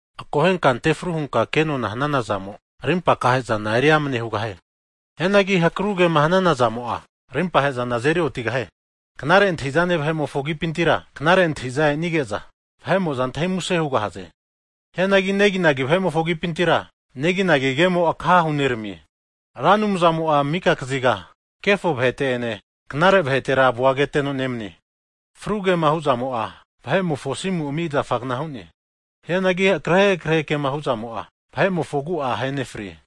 Akohenka antefru hunka ke'nona hanana zamo, rimpa akahe'zana eri'amane hugahie. Hianagi hakrugema hanana zamo'a, rimpahezana azeri otigahie. Knare antahizane vahe'mofo agipintira, knare antahiza e'nige'za vahe'mo'za antahi muse hugahaze. Hianagi neginagi vahe'mofo agipintira, neginagi kemo akaha huneramie. Ra Anumzamo'a mika kaziga kefo vahete' ene, knare vahetera avua keteno nemanie. Fru kema hu'zamo'a vahe'mofo asimu ami zafagna hu'ne. Hianagi akrehe akrehe kema hu'zamo'a, vahe'mofo agu'a ahenefri.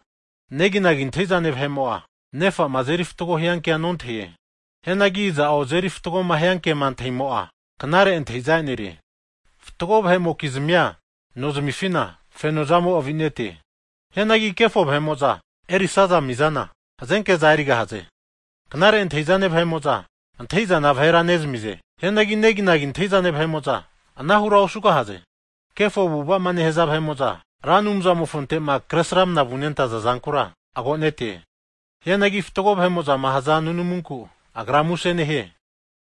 Neginagi antahizane vahe'mo'a nefa'ma azeri fatgo hiankea nontahie. Hianagi iza'o azeri fatgoma hiankema antahimo'a, knare antahiza e'nerie. Fatgo vahe'mokizmia nozamifina, fenozamo avinete. Hianagi kefo vahe'mo'za erisaza mizana, hazenke'za erigahaze. Knare antahi'zane vahe'mo'za, antahizana vahera nezamize. Hianagi neginagi antahizane vahe'mo'za, anahura osugahaze. Kefo avu'avama nehaza vahe'mo'zama, Ra Anumzamofonte'ma kre sramnama vunentaza zankura, agonete. Hianagi fatgo vahe'mo'zama haza nunamunku, Agra muse nehie.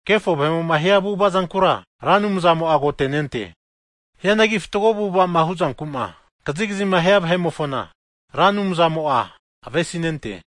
Kefo vahe'mo'ma hia avu'ava zankura, Ra Anumzamo'a agotenente. Hianagi fatgo avu'avama huzanku'ma kazigazima hia vahe'mofona, Ra Anumzamo'a avesinente.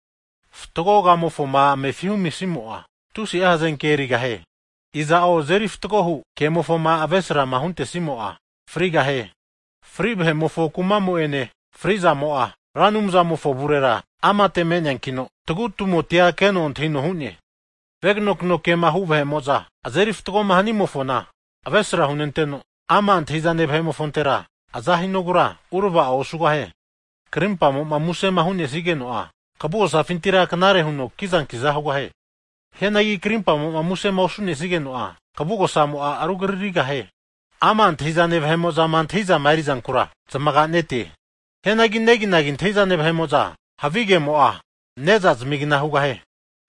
Fatgo kamofoma amefi humisimo'a, tusi'a hazenke erigahie. Iza'o azeri fatgohu kemofoma avesrama huntesimo'a, frigahie. Fri' vahe'mofo kuma'mo'ene frizamo'a, Ra Anumzamofo avurera amate me'neankino, tagutumotia keno antahino hu'ne! Veganokno kema hu vahe'mo'za, azeri fatgoma hanimofona avesra hunenteno, ama' antahizane vahe'mofontera aza hinogura urava'o osugahie. Krimpamo'ma musema hu'nesigeno'a, kavu'gosafintira knare huno kizankiza hugahie. Hianagi karimpamo'ma musema osu'nesigeno'a, kavugosamo'a rugaririgahie. Ama' antahizane vahe'mo'za antahizama erizankura zamaganete. Hianagi neginagi antahizane vahe'mofona havi kemo'a, ne'zama'agna hugahie.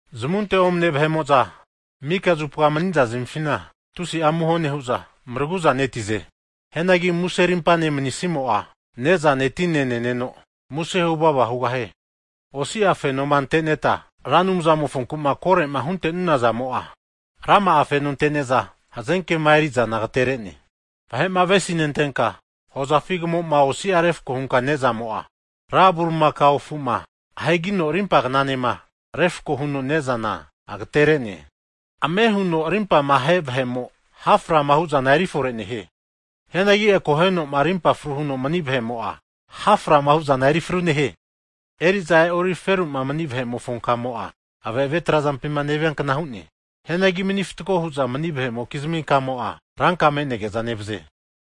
Zamunte omane vahe'mo'za mika zupa maniza zmifina tusi'a amuho nehu'za maragu'zanetize. Hianagi muse arimpane manisimo'a, nezane tine neneno muse huvava hugahie. Osi'a fenoma anteneta Ra Anumzamofonkuma kore'ma huntenunazamo'a, rama'a fenoza ante'neta hazenkema erizana agaterene. Vahe'ma avesinentenka hozafi kamo'ma osia refko hunka ne'zamo'a, ra bulimakao afu'ma ahegino rimpagnanema refkoma huno nezana, agaterene. Ame' hunoma rimpama ahe vahe'mo, ha'frama hu'zana eri fore nehie. Hianagi akohenoma rimpa fru huno mani vahe'mo, ha'frama huzana erifru nehie. Eri'za e'ori feru'ma mani vahemofo kamo'a, ave'ave trazampima neviankna hu'ne. Hianagi mani fatgo hu'za mani vahe'mokizmi kamo'a ranka me'nege'za nevaze.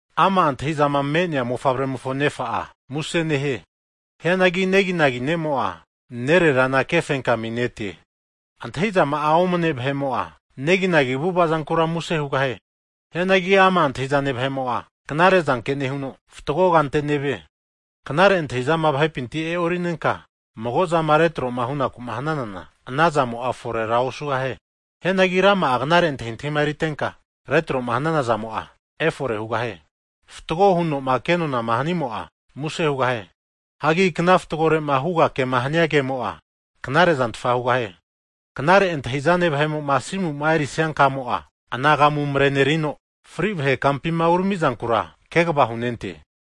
Ama' antahi'zama me'nea mofavremofo nefa'a, muse nehie. Hianagi neginagi ne'mo'a, nererana kefenkaminetre. Antahizama'a omane vahe'mo'a, neginagi avu'avazankura muse hugahie. Hianagi ama' antahizane vahe'mo'a, knare zanke nehuno, fatgo kante nevie. Knare antahizama vahepinti e'orinenka mago'a zama retroma hunaku'ma hananana, ana zamo'a forera osugahie. Hianagi rama'a knare antahintahima eritenka, retroma hanana zamo'a, efore hugahie. Fatgo hunoma kenonama hanimo'a, muse hugahie. Hagi kna fatgore'ma huga kema hania kemo'a, knare'zantfa hugahie. Knare antahi'zane vahe'moma asimu erisia kamo'a anagamu marenerino, fri vahe kumapima uramizankura kegva hunente.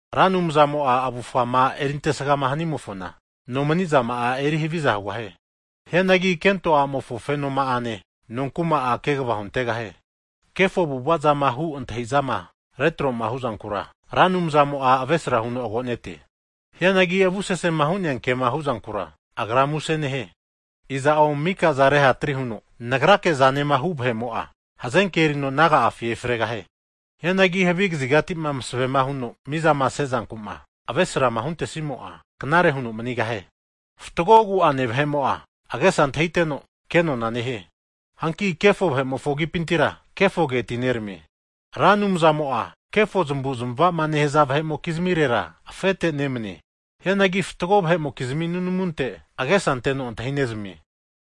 Ra Anumzamo'a avufama eri antesgama hanimofona nomanizama'a, eri haviza hugahie. Hianagi kento a'mofo fenoma'ane nonkuma'a, kegva huntegahie. Kefo avu'avazama hu antahizama retroma huzankura, Ra Anumzamo'a avesra huno agonete. Hianagi avusese hu'nea kema huzankura, Agra muse nehie. Iza'o mika'za rehatri huno nagrike zanema hu' vahe'mo'a, hazenke erino naga'afi efregahie. Hianagi havi kazigatima masavema huno mizama sezankuma avesrama huntesimo'a, knare huno manigahie. Fatgo agu'ane vahe'mo'a agesa antahiteno, kenona nehie. Hanki kefo vahe'mofo agipintera, kefoge atineramie. Ra Anumzamo'a kefo zamavu'zmavama nehaza vahe'mokizmirera, afete nemanie. Hianagi fatgo vahe'mokizmi nunamunte, agesa anteno antahinezamie.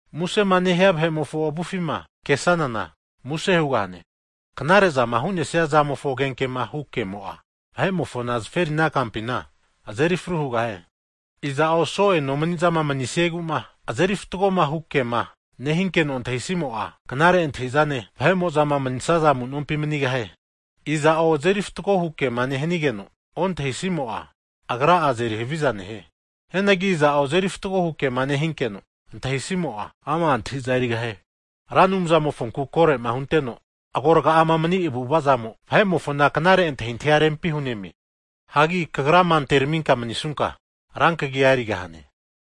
Musema nehia vahe'mofo avufima kesanana, muse hugahane. Knarezama hu'nesia zamofo agenkema hu ke'mo'a, vahe'mofona zaferina kampina azeri fru hugahie. Iza'o so'e nomanizama manisieguma, azeri fatgoma hu kema nehinkeno antahisimo'a, knare antahizane vahe'mozama manisaza amunompi manigahie. Iza'o azeri fatgo hu kema nehanigeno ontahisimo'a, agra'a azeri haviza nehie. Hianagi iza'o azeri fatgo hu kema nehinkeno, antahisimo'a, ama' antahintahi erigahie. Ra Anumzamofonku korema hunteno agorgama mani avu'avazamo, vahe'mofona knare antahintahia rempi hunemie. Hagi kagrama anteraminka manisunka, rankagia erigahane.